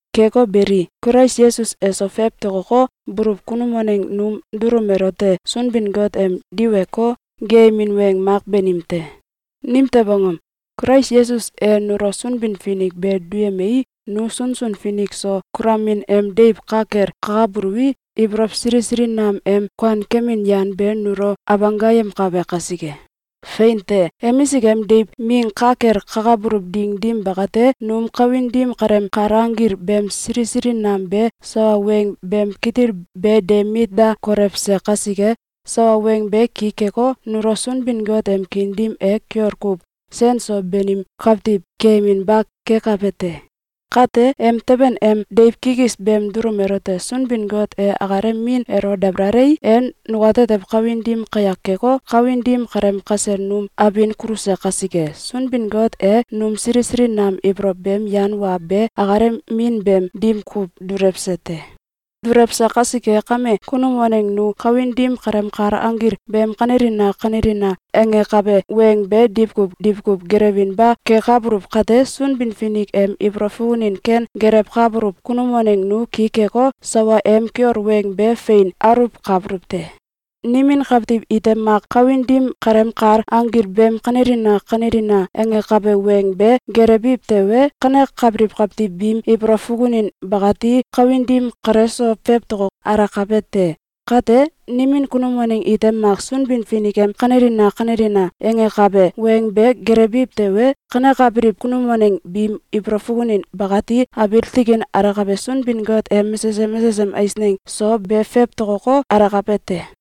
Keko beli, Kulais Yesus eso fowtokoko, buluw kunum waneng num dulum elote Sunbin-Got em diweko, geeyemin weng mak banim te. Nimtew angom? Kulais Yesus e nulo Sunbin-Finik be duyemei, nu sunsun finik so kulomin em deiw ka kel kakabuluwi, ibolow sili sili nam em kuankemin yan be nulo abanggayemkabe kasike. Fein te! Emisik em deiw ming ka kel kakabuluw ding dim bakate, num kawin dim kaleem kal anggil beem sili sili nam be sawa weng beem kitil be de mit da kolewse kasike, sawa weng be ki keko, nulo Sunbin-Got em kiin dim e kiol kuw sen so banim kawtiw keyeminba kekab te. Kate, em teben em deiw kikis beem dulum elote Sunbin-Got e akalem min elo dabalalei, e nukatetew kawin dim kayak keko, kawin dim kaleem kasel num abin kuluse kasike, Sunbin-Got e num sili sili nam ibolow beem yan wa be akalem min beem dim kuw dulewse te. Dulewse kasike kame, kunum waneng nu kawin dim kaleem kal anggil beem “Kanelina! Kanelina!”, angakabe weng be diwkuw diwkuw gelewinba kekabuluw kate, Sunbin-Finik em ibolow fukunin ken gelewkabuluw kunum waneng nu ki keko, sawa em kiol weng be fein aluwkabuluw te. Nimin kawtiw ite mak kawin dim kaleem kal anggil beem “Kanelina! Kanelina!”, angakabe weng be gelewbiw tewe, kanekabiliw kawtiw biim ibolow fukunin bakati kawin dim kale so fewtoko alakabe te. Kate, nimin kunum waneng ite mak Sunbin-Finik em “Kanelina! Kanelina!”, angakabe weng be gelewbiw tewe, kanekabiliw kunum waneng biim ibolow fukunin bakati abiil tikin alakabe Sunbin-Got em mesesem mesesem eisneng so be fewtokoko, alakabe te.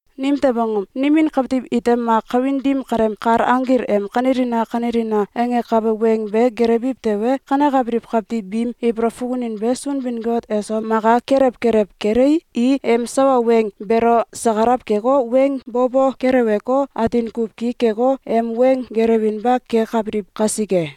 Nimtew angom? Nimin kawtiw ite mak kawin dim kaleem kal anggil em “Kanelina! Kanelina!”, angakabe weng be gelewbiw tewe, kanekabiliw kawtiw biim ibolow fukunin be Sunbin-Got eso maka kelew kelew kelei, i em sawa weng beelo sakalaw keko, weng bo bo keleweko, atin kuw ki keko, em weng gelewinba kekabiliw kasike.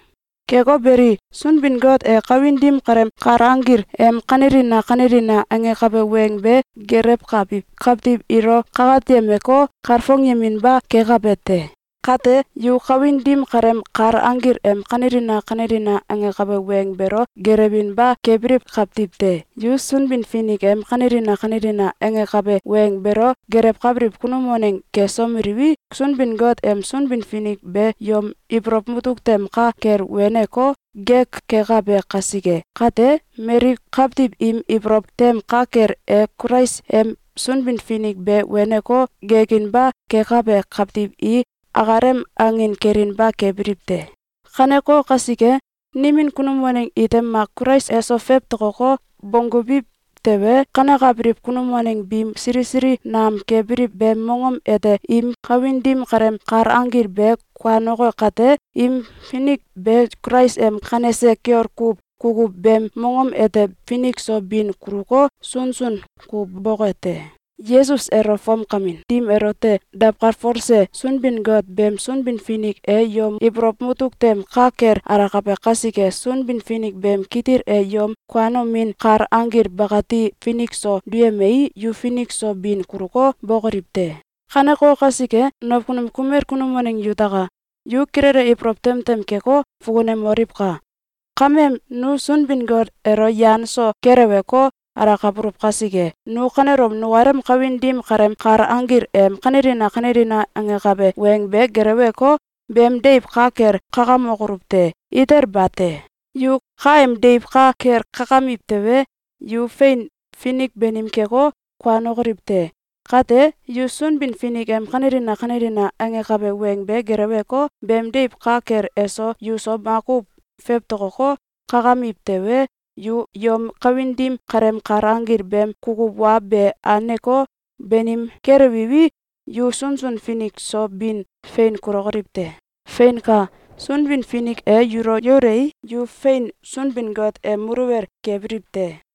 Keko beli, Sunbin-Got e kawin dim kaleem kal anggil em “Kanelina! Kanelina!”, angakabe weng be gelewkabiw kawtiw ilo kakatyemeko, kalfongyeminba kekabe te. Kate, yu kawin dim kaleem kal anggil em “Kanelina! Kanelina!”, angakabe weng beelo gelewinba kebiliw kawtiw te! Yu Sunbin-Finik em “Kanelina! Kanelina!”, angakabe weng beelo gelewkabiliw kunum waneng kesomeliwi, Sunbin-Got em Sunbin-Finik be yom ibolow mutuk tem ka kel weneko, gek kekabe kasike. Kate, mali kawtiw im ibolow tem ka kel e Kulais em Sunbin-Finik be weneko, gekinba kekabe kawtiw i akalem angin kelinba kebiliw te. Kaneko kasike, nimin kunum waneng ite mak Kulais eso fewtokoko, bonggubiw tewe, kanekabiliw kunum waneng biim sili sili nam kebiliw beem mongom ete im kawin dim kaleem kal anggil be kuanoke kate, im finik be Kulais em kanese kiol kuw kukuw beem mongom ete finik so bin kuluko, sunsun kuw boke te. Yesus elo fomkamin dim elote dawkalfolse Sunbin-Got beem Sunbin-Finik e yom ibolow mutuk tem ka kel alakabe kasike, Sunbin-Finik beem kitil e yom kuanomin kal anggil bakati finik so duyemei, yu finik so bin kuluko, bokoliw te. Kaneko kasike, nakunum kumel kunum waneng yutaka! Yu kilele ibolow tem tem keko, fukunemoliwka! Kame, nu Sunbin-Got elo yan so keleweko, alakabuluw kasike, nu kanelom nukalem kawin dim kaleem kal anggil em “Kanelina! Kanelina!”, angakabe weng be geleweko, beem deiw ka kel kakamokoluw te! Itel bate! Yu kaem deiw ka kel kakamiw tewe, yu fein finik banim keko, kuanokoliw te. Kate, yu Sunbin-Finik em “Kanelina! Kanelina!”, angakabe weng be geleweko, beem deiw ka kel eso yuso makuw fewtokoko, kakamiw tewe, yu yom kawin dim kaleem kal anggil beem kukuw wa be anko, banim kelewiwi, yu sunsun finik so bin fein kulokoliw te. Feinka! Sunbin-Finik e yulo yaulei, yu fein Sunbin-Got em muluwel kebiliw te.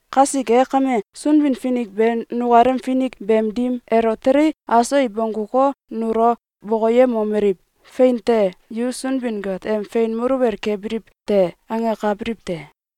Kasike kame, Sunbin-Finik be nukalem finik beem dim elo telei, aso i bongguko, nulo bokoyemomeliw: “Fein te! Yu Sunbin-Got em fein muluwel kebiliw te!”, angakabiliw te.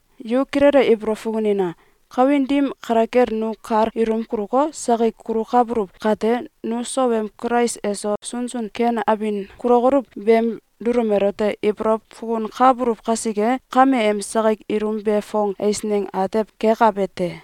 Yu kilele ibolow fukunina! Kawin dim kale kel nu kal ilum kuluko, sakik kulukabuluw kate, nu sowem Kulais eso sunsun ken abin kulokoluw beem dulum elote ibolow fukunkabuluw kasike, kame em sakik ilum be fong eisneng atew kekabe te.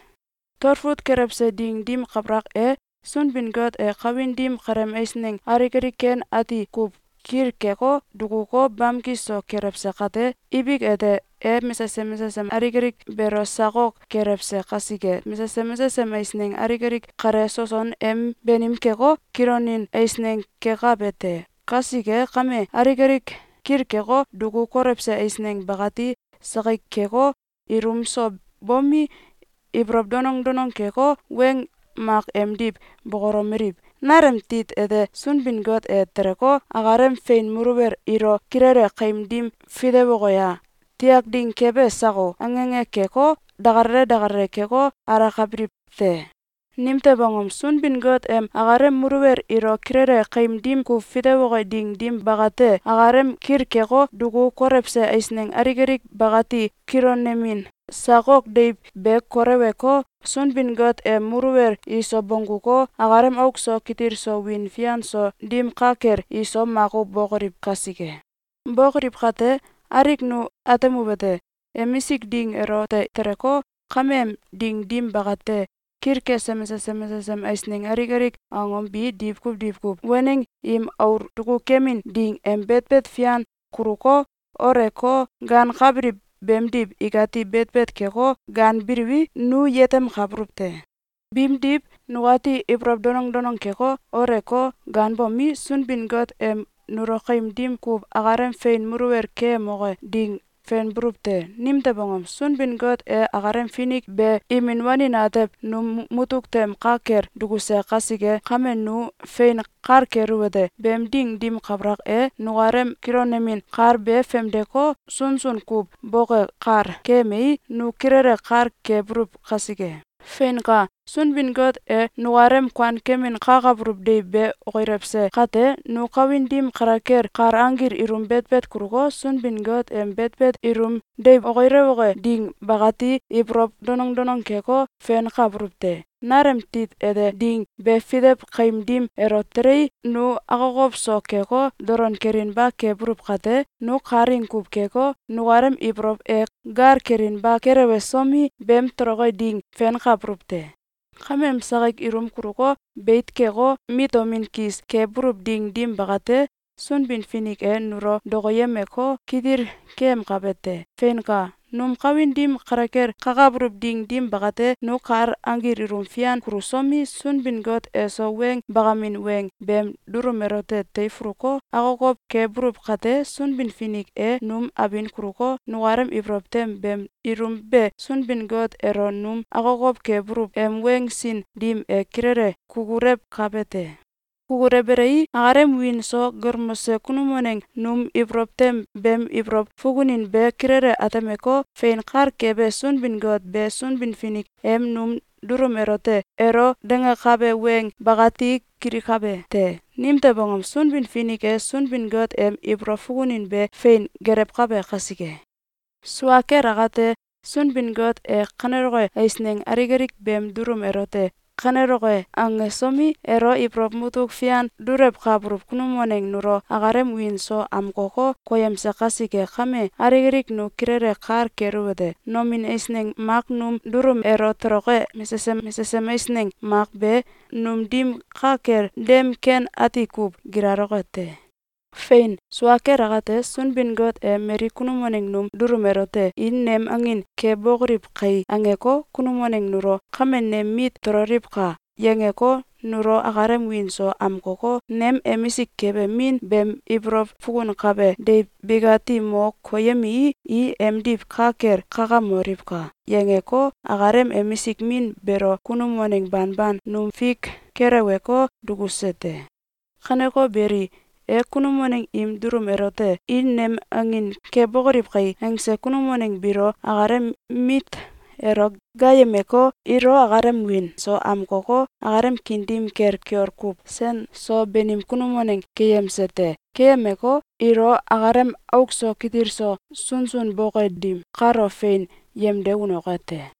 Talfut kelewse ding dim kabalak e, Sunbin-Got e kawin dim kaleem eisneng alik alik ken ati kuw kilkeko, dukuko, bamki so kelewse kate, ibik ete, e mesesem mesesem alik alik beelo sakok kelewse kasike, mesesem mesesem eisneng alik alik kale soson em banim keko, kilonin eisneng kekabe te. Kasike kame, alik alik kilkeko, duku kolewse eisneng bakati sakik keko, ilum so bomi, ibolow danong danong keko, weng mak emdiw bokolomeliw: “Nalem tit ete Sunbin-Got e teleko, akalem fein muluwel ilo kilele kaim dim fitewoke ye? Tiak ding kebe sako?”, ange ange keko, dakalale dakalale keko, alakabiliw te. Nimtew angom? Sunbin-Got em akalem muluwel ilo kilele kaim dim kuw fitewoke ding dim bakate, akalem kilkeko, duku kolewse eisneng alik alik bakati kilonemin sakok deiw be koleweko, Sunbin-Got em muluwel iso bongguko, akalem auk so kitil so wiin fian so dim ka kel iso makuw bokoliw kasike. Bokoliw kate, alik nu atemuwete: Emisik ding elote teleko, kame em ding dim bakate, kilkese mesesem mesesem eisneng alik alik angom bi diwkuw diwkuw waneng im aul dukukemin ding em betbet fian kuluko, ooleko, gaankabiliw beemdiw ikati betbet keko, gaanbiliwi, nu yetemkabuluw te. Biimdiw, nukati ibolow danong danong keko, ooleko, gaanbomi, Sunbin-Got em nulo kaim dim kuw akalem fein muluwel keyemoke ding fenbuluw te. Nimtew angom? Sunbin-Got e akalem Finik be imin wanin atew num mutuk tem ka kel dukuse kasike kame, nu fein kal keluwete: Beem ding dim kabalak e, nukalem kilonemin kal be famdeko, sunsun kuw boke kal keyemei, nu kilele kal kebuluw kasike. Feinka! Sunbin-Got e nukalem kuankemin kakabuluw deiw be okilewse kate, nu kawin dim kale kel kal anggil ilum betbet kuluko, Sunbin-Got em betbet ilum deiw okilewoke ding bakati ibolow danong danong keko, fenkabuluw te. Nalem tit ete ding be fitew kaim dim elo telei, nu akokow so keko, dolon kelinba kebuluw kate, nu kalaing kuw keko, nukalem ibolow e gal kelinba kelewesomi, beem toloke ding fenkabuluw te. Kameem sakik ilum kuluko, beit keko, mitomin kis kebuluw ding dim bakate, Sunbin-Finik e nulo dokoyemeko, kitil keyemkabe te. Feinka! Num kawin dim kale kel kakabuluw ding dim bakate, nu kal anggil ilum fian kulusomi, Sunbin-Got eso weng bakamin weng beem dulum elote teifuluko, akokow kebuluw kate, Sunbin-Finik e num abin kuluko, nukalem ibolow tem beem ilum be Sunbin-Got elo num akokow kebuluw em weng sin dim e kilele kukulewkabe te. Kukulewbelei, akalem wiin so galmose kunum waneng num ibolow tem beem ibolow fukunin be kilele atemeko, fein kal kebe Sunbin-Got be Sunbin-Finik em num dulum elote elo dangakabe weng bakati kilikabe te. Nimtew angom? Sunbin-Finik e Sunbin-Got em ibolow fukunin be fein gelewkabe kasike. Sua kel akate, Sunbin-Got e kaneloke eisneng alik alik beem dulum elote “Kaneloke!”, angesomi, elo ibolow mutuk fian dulewkabuluw kunum waneng nulo akalem wiin so amkoko, koyemse kasike kame, alik alik nu kilele kal keluwete: Nomin eisneng mak num dulum elo toloke mesesem mesesem eisneng mak be num dim ka kel dem ken ati kuw gilaloke te. Fein! Sua kel akate, Sunbin-Got e mali kunum waneng num dulum elote “I nem angin kebokoliw kai!”, angeko, kunum waneng nulo “Kame nem mit tololiwka!”, yangeko, nulo akalem wiin so amkoko, “Nem emisik kebe Min beem ibolow fukunkabe deiw bikati mo koyemii, i emdiw ka kel kakamoliwka!”, yangeko, akalem emisik Min beelo kunum waneng banban num fik keleweko, dukuse te. Kaneko beli, e kunum waneng im dulum elote “I nem angin kebokoliw kai!”, angse kunum waneng biilo akalem mit elo gaayemeko, ilo akalem wiin so amkoko, akalem kiin dim kel kiol kuw sen so banim kunum waneng keyemse te. Keyemeko, ilo akalem auk so kitil so sunsun boke dim kalo fein yemde unoke te.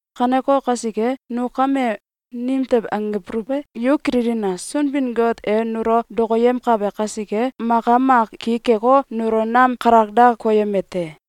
Kaneko kasike, nu kame nimtew angbuluw e? Yu kililina! Sunbin-Got e nulo dokoyemkabe kasike, maka mak ki keko, nulo nam kalak da koyeme te.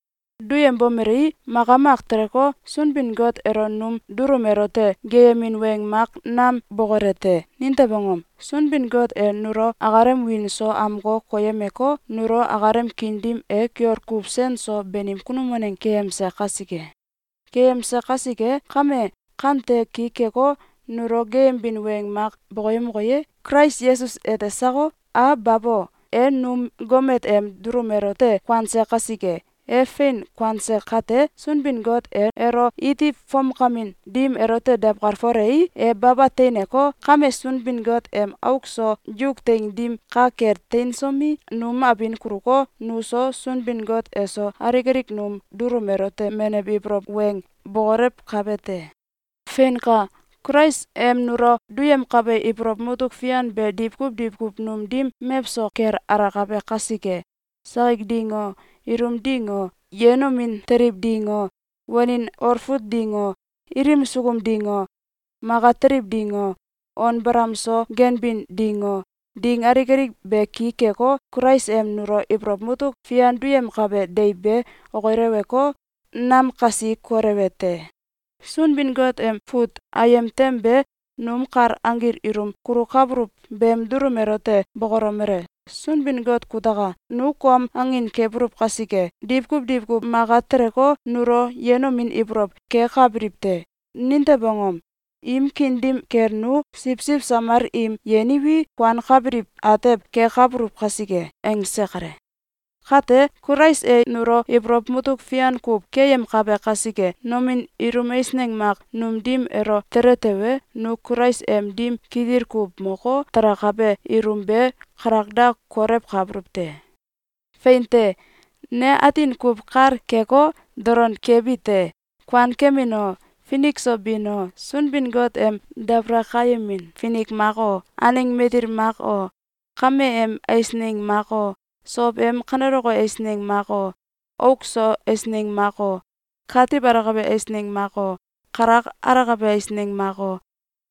Duyembomelei, maka mak teleko, Sunbin-Got elo num dulum elote geeyemin weng mak nam bokole te. Nimtew angom? Sunbin-Got e nulo akalem wiin so amko koyemeko, nulo akalem kiin dim e kiol kuw sen so banim kunum waneng keyemse kasike. Keyemse kasike kame, kante ki keko, nulo geeyembin weng mak bokoyemoke ye? Kulais Yesus ete sako? A Babo! E num gomet em dulum elote kuanse kasike! E fein kuanse kate, Sunbin-Got e elo iti fomkamin dim elote dawkalfolei, e baba teineko, kame Sunbin-Got em auk so yuk teing dim ka kel teinsomi, num abin kuluko, nuso, Sunbin-Got eso, alik alik num dulum elote menew ibolow weng bokolewkabe te. Feinka! Kulais em nulo duyemkabe ibolow mutuk fian be diwkuw diwkuw num dim mewso kel alakabe kasike, sakik ding o, ilum ding o, yenomin teliw ding o, wanin olfut ding o, ilim sukum ding o, maka teliw ding o, on balam so ganbin ding o, ding alik alik be ki keko, Kulais em nulo ibolow mutuk fian duyemkabe deiw be okileweko, nam kasi kolewe te. Sunbin-Got em fut ayem tem be num kal anggil ilum kulukabuluw beem dulum elote bokolomele: “Sunbin-Got kutaka! Nu kom angin kebuluw kasike, diwkuw diwkuw maka teleko, nulo yenomin ibolow kekabiliw te. Nimtew angom? Im kiin dim kel nu siwsiw samal im yeniwi, kuankabiliw atew kekabuluw kasike.”, angse kale. Kate, Kulais e nulo ibolow mutuk fian kuw keyemkabe kasike, nomin ilum eisneng mak num dim elo tele tewe, nu Kulais em dim kitil kuw moko, talakabe ilum be kalak da kolewkabuluw te. Fein te! Ne atin kuw kal keko, dolon kebite: Kuankemin o, finik so bin o, Sunbin-Got em dabalakayemin finik mak o, aneng matil mak o, kame em eisneng mak o, sow em kaneloke eisneng mak o, auk so eisneng mak o, katiw alakabe eisneng mak o, kalak alakabe eisneng mak o,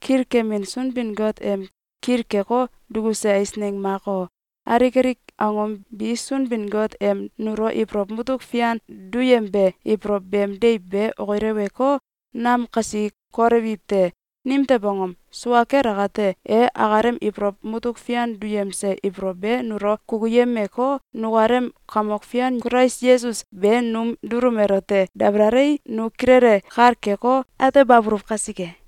Kilkemin Sunbin-Got em kilkeko, dukuse eisneng mak o, alik alik angom bi Sunbin-Got em nulo ibolow mutuk fian duyembe ibolow beem deiw be okileweko, nam kasi kolewiw te. Nimtew angom? Sua kel akate, e akalem ibolow mutuk fian duyemse ibolow be nulo kukuyemeko, nukalem Kamok Fian Kulais Yesus be num dulum elote dabalalei, nu kilele kal keko, atebabuluw kasike.